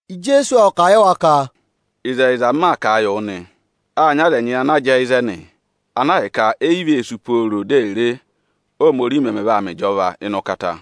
Ijeesu ộ kà a yị wa ka, “Ịzẹyịza, m maa kà a yị wụ nịnị nị, â nyị aza ẹnyị ana jẹẹ ịzẹnị, ana ahịka e yi vee sú pooro di è re, Óhomorihi mẹmẹ vaa mẹ ohinọyị anịị beri ụkata.”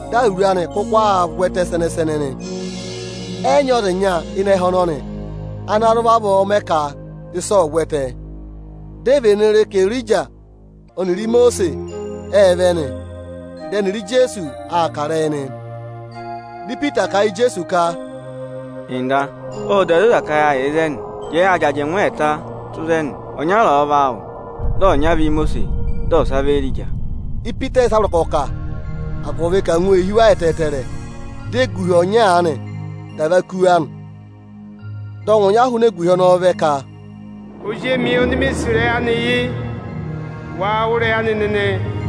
Dị awuru anị kụkụ aa vwẹtẹ sẹnẹ-sẹnẹ nị. Ẹ yị nyị ọza ịnya ịnị ẹhẹ ọnọnị, ana zụ vavọọ mẹ ka ịsa ọ̀ vwẹtẹ. Di e vene re ka Erija ọnịrị Imosiisi ệ vẹ nị. Dị ẹnịrị Ijeesu aa kà ịrẹyị nị. Dị Ipita kà a yị Ijeesu ka, “Nda, ộ da zoza ka yâ yà ịzẹnị. Jẹẹ ya jị ajẹngụ ẹẹta tụ́ ịzẹnị: ọnyara ọ̀ọ vị áawụ, dị ọnya vị Ímosiisi, dị ọsa vị Éerija.” Ipita ọ yị yẹ ịsa a vọrọ ka ọ̀ kà, agụvị ka angwa ee hí wa ẹtẹẹtẹrẹ. Dị eguhi ọnya aanị dà và kú wa nị. Dị ọngwẹ ọnya hụụnị eguhi ọnọọ vẹ ka, “Ozi emi oni mi sì ịrẹyị anị yị, waa wụ́ ịrẹyị anị nịnị!”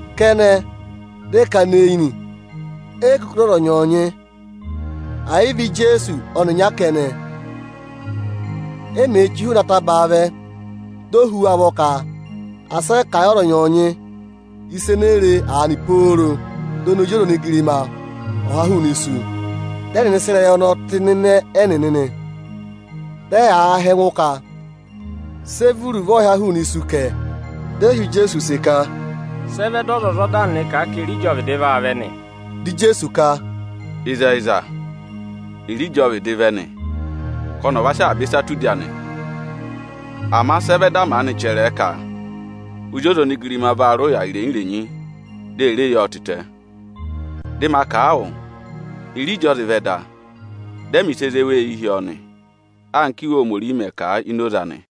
Kẹnẹ, dị ẹ kana eyi nị, e yi kuku re ọza ọnyọọnyị, ẹ yị vị Ijeesu ọnịnya kẹnẹ. E mèe chíi hụụnị atabaa vẹ, di o hú wa ụvọ ka asị ẹ kà a yị ọza ọnyọọnyị ịsa enee re aanị pooro dị ọnị Ozi ọza onigirima ọ̀ ha hụụnị isu. Dị ẹnịnị sị ịrẹyị ọnọọ tẹ ịnịnẹ ẹnịnị nị. Dị ẹyaa họ̀ ẹngụ ka, “Sị ẹ vị iruvo ọyịha hụụnị isu kẹ?” Dị ẹ họ̀ Ijeesu use ka, “Sị ẹ vẹ dị ọzwọzọda nịnị kà a ka Erija ọ vịdị vaa vẹ nị?” Dị Ijeesu ka, “Ịzẹyịza, Erija ọ vịdị vẹ nị, ka ọnị ọ̀ va sị avaba ịsa tụ́ udi anị. Ama sị ẹ vẹ dị a maanị chẹrẹ ẹ ka Ozi ọza onigirima vaa rị ụya irenyi-irenyi, di e re yi ọọ tịtẹ? Dị ma kà a wụ, Erija ọ zị vẹ da, dị ẹ mẹ̀ ịsa ene zé wa eyi hi ọọ nị, anka Íwe Ohomorihi mẹ̀ kà a ini oze anị.”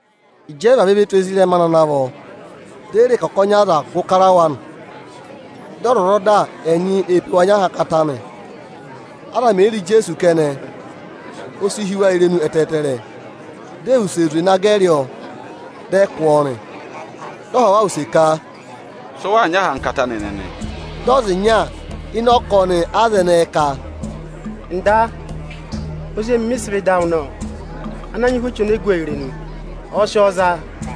Ịjị ẹ vavẹ ve tù ezirẹma anị ana vọ, di e re ka ọkọnị aza gụ kara wa nị. Dị ọzwọzọda ẹnyị ee pe wa nyị ahankata nị. Aza mè yi re Ijeesu kẹnẹ, o si hí wa irenu ẹtẹẹtẹrẹ, di e wuse zwe na gẹrị ọọ, dị ẹ kụ́ ọọ nị. Dị ọ họ̀ wa use ka, “Sị ụ waa nyị ahankata anị nịnị?” Dị ọza ịnya ịnị ọkọnị aza ẹnẹẹ ka, “Nda, ozi emi mị sị vẹ ịdị awụ nọ, ộ nyị ụhwẹ echu ene gu ọọ irenu. Ọ̀ọ sị ọọ za,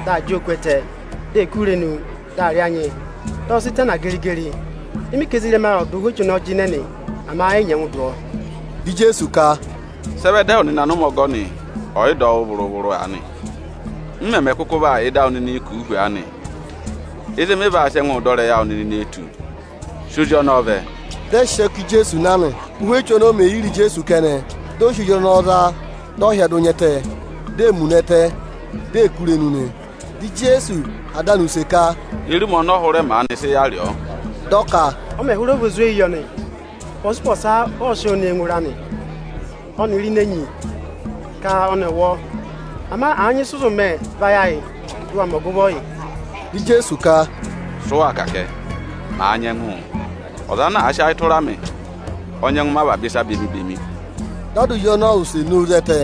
dị aa jị ọọ kú ẹtẹ, di ee kú irenu, dị aa rị anyị, dị ọ sị tana geri-geri. Dị mị ka ezirẹma awụ ẹ̀ dụ ụhwẹ echu ọnọọ jịnẹ nị, ama ẹ yị nyẹngụ dụ ọọ.” Dị Ijeesu ka, “Sị ẹ vẹ dị ẹwụ nịnị anụmẹ ọgọnị ọ̀ yị dọ wụ́ vụrụ-vụrụ aanị? M mẹmẹ kụkụ vaa yà ịdị awụ nịnị kùu hu aanị? Ịzị mị vaa sị ẹngụụ dọ ịrẹyị awụ nịnị nee tù? Sị ozi ọnọọ vẹ!” Dị ẹ sị ọọ ká Ijeesu na nị. Ụ́hwẹ echu ọnọọ mè yi re Ijeesu kẹnẹ, dị ọ sị ozi ọnọọ za, dị ọ hyẹdụ nya ẹtẹ, di ee muna ẹtẹ, di ee kú irenu nị. Dị Ijeesu họ̀ ada anị use ka, “Ye re ụmẹ ọnọọ hụrẹ maanị sị yà rị ọọ?” Dị ọ ka, “Ọ mẹ̀ hụrẹ vị ozweyi yọ nị. Ụpọsa-ụpọsa ọ sịị̄ sị ọọ ne ngụ ịra, ọnịrị ini enyi, ka ọnị ọ̀ wụ ọọ nị. Ama àa nyị ịsị ụ zụ mẹ, vayị ayị, dị ụ wa mẹ ọgụvọ yị!” Dị Ijeesu ka, “Sị ụ waa kà kẹ, màa nyẹngụụ? Ọza ana àa sị ayị tụra mị, ọ nyẹngụ mẹ avaba ịsa bemi-bemi.” Dị ada ozi ọnọọ wụsẹ nowu zẹtẹ,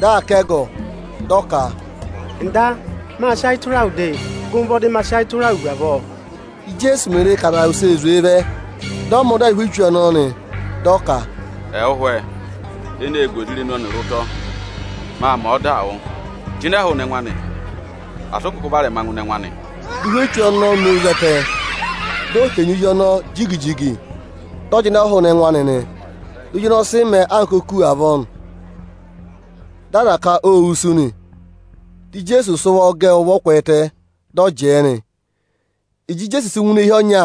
dị aa ká ẹgọ, dị ọ ka, “Nda, mâ sị ayị tụra wụ de; gụ mị ụvọ dị ma sị ayị tụra wụ hu avọọ!” Íjeesu mè re ka aza wusee zwee vẹ, dị ọ mẹ da yị ụhwẹ echu ọnọọ nị, dị ọ ka, “Ẹwụ ụhwẹ, eneē gu ọza irenu ọnịrị ụtọ, maa mẹ̀ ọdaa wụ, jịnẹ hụụnị ẹngụ anị, asị ụ kụkụ varẹma ngụ ịnị ẹngụ anị!” Dị ụhwẹ echu ọnọọ nowu zẹtẹ, di o henyi ozi ọnọọ jigi-jigi, dị ọ jịnẹ hụụnị ẹngụ anị nị. Dị ozi ọnọọ sị mẹẹ anka oku avọọ nị. Dị aza ka ô wusu nị. Dị Ijeesu sị ụvọ gẹ ẹ ụvọ kwẹẹtẹ, dị ọ jẹẹ nị. Ịjị Ijeesu sị ngụ ini eehi ọnya,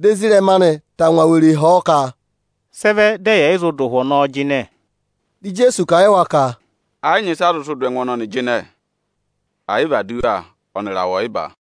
dị ezirẹma anị tangwa were họ̀ ọ ka, “Sị ẹ vẹ dị ẹyị ẹ̀ yị zụ dụ ụhwẹ ọnọọ jịnẹ?” Dị Ijeesu kà a yị wa ka, “Ẹ yị nyị ịsị a zụ sị dụ ẹngụ ọnọnị jịnẹ, ẹ̀ yị vị aduwa (ọnịrị awẹ ọyịba).”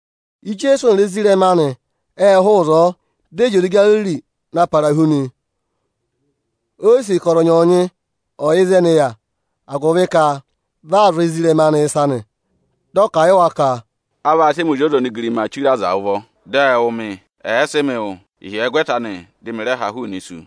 Ijeesu ọnịrị ezirẹma anị ệ hụụ ịzọọ, dị ẹ zị oze Igariri na para hu nị. O yi sì ka ọza ọnyọọnyị ọ̀ yẹ ịzị ẹnị yà, agụvị ka vị aa zụ̀ ezirẹma anị ịsa nị. Dị ọ kà a yị wa ka, “A vaa sị ẹmị Ozi ọza onigirimaa chire aza ụvọ, dị ẹ wụ̀ mị; ẹ̀ẹ sị mị wụ, ịhyẹgwẹta anị dị mị rẹ ha hụụnị isu.”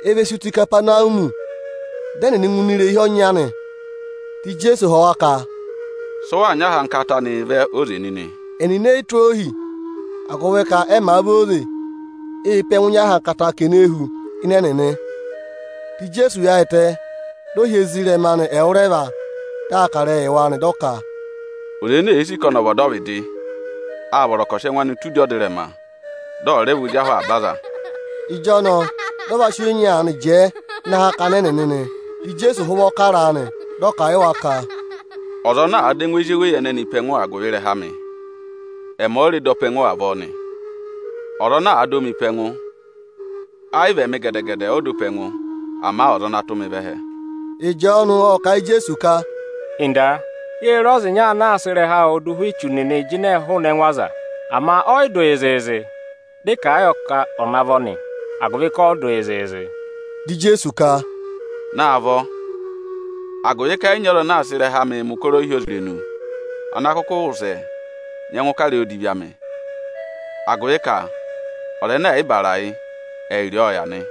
E ve si tù Ikapanawumi. Dị ẹnịnị ngụ ini irehi ọnya nị. Dị Ijeesu họ̀ wa ka, “Sị ụ waa nyị ahankata anịị vẹ óze nịnị?” Ẹnịnị e yi tụ́ ohi, agụvị ka ẹ màa vẹ óze, ê pe ẹngụ nyị ahankata ka ene hu ịnị ẹnịnị. Dị Ijeesu yaayịtẹ, dị ọ hị́ ezirẹma anị ẹwụrẹva, dị aa kà ịrẹyịị yị wa nị, dị ọ ka, “Ọza ene èe sì ka ọnị ọ̀ vị ọdọvịdị, â vọrọ ka ọ̀ sị ẹngụ anị tụ́ udi ọdịrẹma, dị ọ̀ rẹ vị ozi ahụ avaba aza.” Ịjọnọọ dị ọ va sị ozi ọnya aanị jẹẹ ịnị akakana ẹnịnị nị. Dị Ijeesu há ụvọ kara a nị, dị ọ kà a yị wa ka: “Ọza ana àa dọ ẹngụ ezi eweyi ẹnẹnị pe ẹngụ agụvị ịrẹha amị, ẹmị ọ rẹ dọ pe ẹngụ avọọ nị. Ọza ana àa dọ mị pe ẹngụ, ẹ yị vị ẹmị gẹdẹ-gẹdẹ ọ dọ pe ẹngụ, ama ọza ana tụ́ mị vẹ ẹhẹ ọ dọ nị.” Ịjọọnụ ộ kà a yị Ijeesu ka, “Nda, yê re ọza ịnya ana aa sị ịrẹha awụụ dụ ụhwẹ echu nịnị ị jịnẹẹ hụụnị ẹngụ aza, (ama ọ yị dụ yị zịịzị); dị ị kà a yọ ka ọ̀ navọ nị, agụvị ka ọ yị dụ yị zịịzị.” Dị Ijeesu ka, “Naavọ, agụvị ka ẹ yị nyị ọza anaā sịị ịrẹha amịị mẹ̀ ụkọrọ ohyozirenu, ana kụkụ wụsẹ nyẹngụ kà ịrẹyị odivi amị; agụvị ka ọza ẹnẹ ẹ̀ yị bàrà yị, ẹ yị rị ọọ ọ yà nị.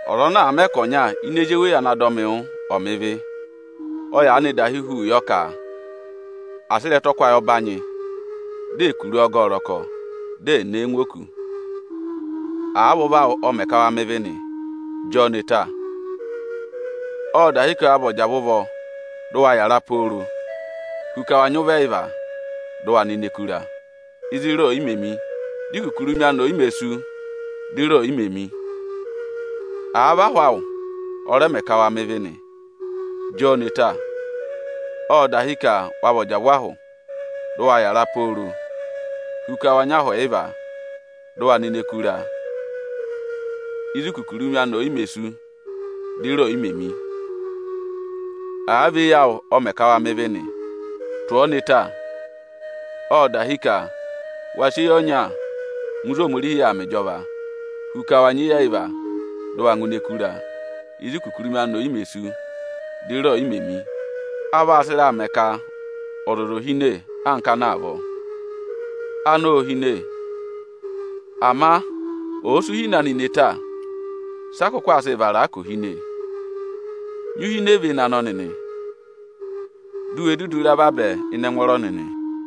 “Ọza ana àa mẹ ka ọnya ini ezi eweyi ana dọ mị wụ́ aanị, ọ̀ mẹ ịvị, ọ yaanị dahi hu yọ ka à sị ịrẹtọkwayị ọbanyị, dị ẹ̀ kuru ọọ gẹ ẹ ọrọkọ, di è ne e ngụ oku. Àa vị ụvọ awụ ọ mẹ ka wa mẹ ịvị nị, jị ọọ ne ta! Ộ dahi ka wa vị ọjavụ ụvọ dị ụ wa yàra pooro, hu ka wa nyị ụvọ ẹyịva, dị ụ wa nọ ini ẹkụra, ịzị ịra ò yi mē mi [di ikukurumi anị ò yi mē sú, dị ịra ò yi mē mi] Àa vị ahụ awụ ọ rẹ mẹ ka wa mẹ ịvị nị, jị ọọ ne ta! Ộ dahi ka wa vị ọjavụ ahụ, dị ụ wa yàra pooro, hu ka wa nyị ahụ ẹyịva, dị ụ wa nọ ini ẹkụra [ịzị ikukurumi anị ò yi mē sú, dị ịra ò yi mē mi] Àa vị eyi awụ ọ mẹ ka wa mẹ ịvị nị, tụ̀ ọọ ne ta! Ộ dahi ka wa sị eyi ọnya ngụ ịzị Ohomorihi yà aa mẹ ịjọva, hu ka wa nyị eyi ẹyịva, dị ụ wa ngụ ini ẹkụra, ịzị ikukurumi anị ò yi mē sú, dị ịra ò yi mē mị. A vaa sị ịraa mẹ ka ọzọza ò hine anka anọ avọọ. Anọ ô hine, ama ọ̀ọ sị uhine anị ne ta, sị a kụkụ aa sịị vara a ka ò hine? Nyị uhine véné anọ nịnị, di u we dudu ra vabẹ ịnị ẹngwọọrọ nịnị!”